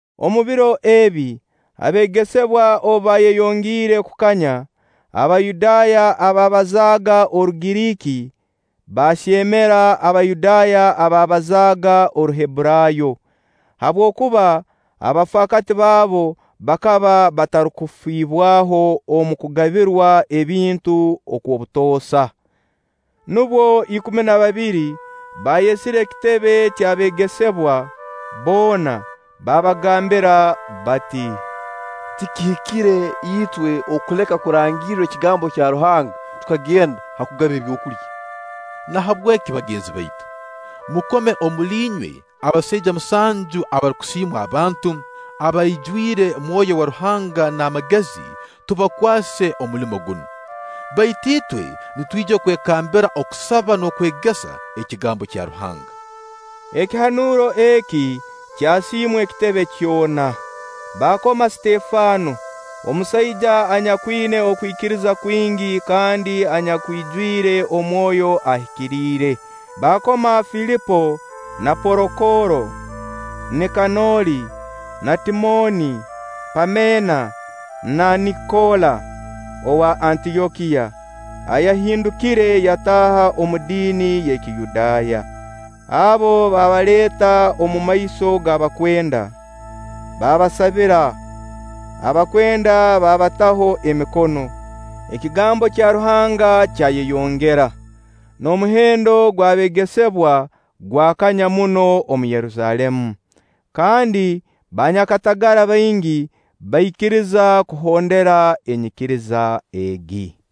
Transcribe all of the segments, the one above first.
Omu biro ebi, abeegesebwa obu baayeyongiire kukanya, Abayudaaya abaabazaaga Orugiriiki baahyemera Abayudaaya abaabazaaga Oruhebburaayo, habwokuba abafaakati baabo bakaba batarukufibwaho omu kugabirwa ebintu okw'obutoosa. Nubwo ikumi na babiri baayesire ekitebe ky'abeegesebwa boona, baabagambira bati: “Tikihikire itwe okuleka kurangirra ekigambo kya Ruhanga tukagenda ha kugaba ebyokulya. Nahabweki bagenzi baitu, mukome omuli inywe abasaija musanju abarukusiimwa abantu, abaijwire Mwoyo wa Ruhanga n'amagezi, tubakwase omulimo gunu. Baitu itwe nitwija kwekambira kusaba n'okwegesa ekigambo kya Ruhanga.” Ekihanuuro eki kyasiimwa ekitebe kyona, baakoma Sitefano, omusaija anyakwina okwikiriza kwingi kandi anyakwijwire Mwoyo Ahikiriire, baakoma Filipo na Porokooro, Nikanoori na Timooni, Paamena na Nikola owa Antyokiya ayahindukire yataaha omu diini y'ekiyudaaya. Abo baabaleeta omumaiso g'abakwenda, baabasabira, abakwenda baabataho emikono. Ekigambo kya Ruhanga kyayeyongera, n'omuhendo gw'abeegesebwa gwakanya muno omu Yerusaalemu, kandi banyakatagara baingi baikiriza kuhondera enyikiriza egi.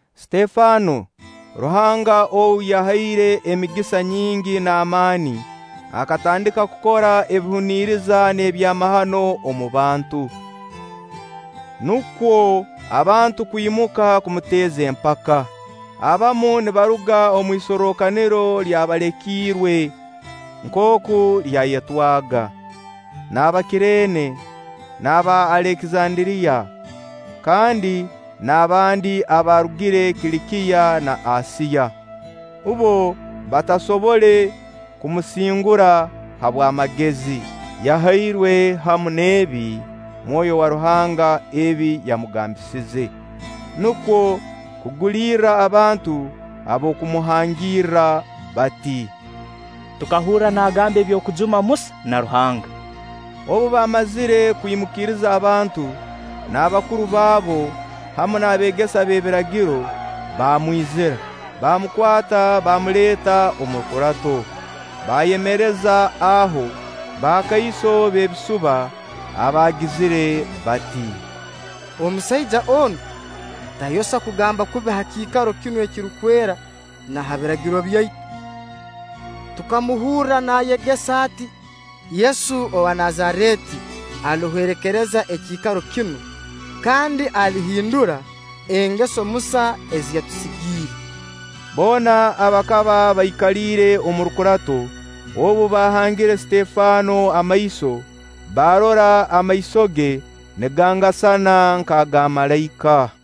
Sitefano, Ruhanga ou yahaire emigisa nyingi n'amaani, akatandika kukora ebihuniriza n'ebyamahano omu bantu. Nukwo abantu kwimuka kumuteeza empaka, abamu nibaruga omu isorrokaniro ly'Abaalekiirwe (nkooku lyayetwaga) n'Abakirene n'Aba Alekizanderiya, kandi n'abandi abaarugire Kilikiya na Asiya. Bbo batasobole kumusingura habw'amagezi yahairwe hamu n'ebi Mwoyo wa Ruhanga ebi yamugambisize. Nukwo kugulirra abantu ab'okumuhangirra bati: “Tukahurra naagamba eby'okujuma Musa na Ruhanga.” Obu baamazire kwimukiriza abantu n'abakuru baabo hamu n'abeegesa b'ebiragiro, baamwizira, baamukwata, baamuleeta omu rukurato. Baayemereza aho bakaiso b'ebisuba abaagizire bati: “Omusaija onu tayosa kugamba kubi ha kiikaro kinu ekirukwera na ha Biragiro byaitu. Tukamuhurra naayegesa ati: Yesu owa Nazareeti alihwerekereza ekiikaro kinu, kandi alihindura engeso Musa ezi yatusigiire.” Boona abakaba baikaliire omu rukurato obu bahangire Sitefano amaiso, baarora amaiso ge nigangasana nk'aga malaika.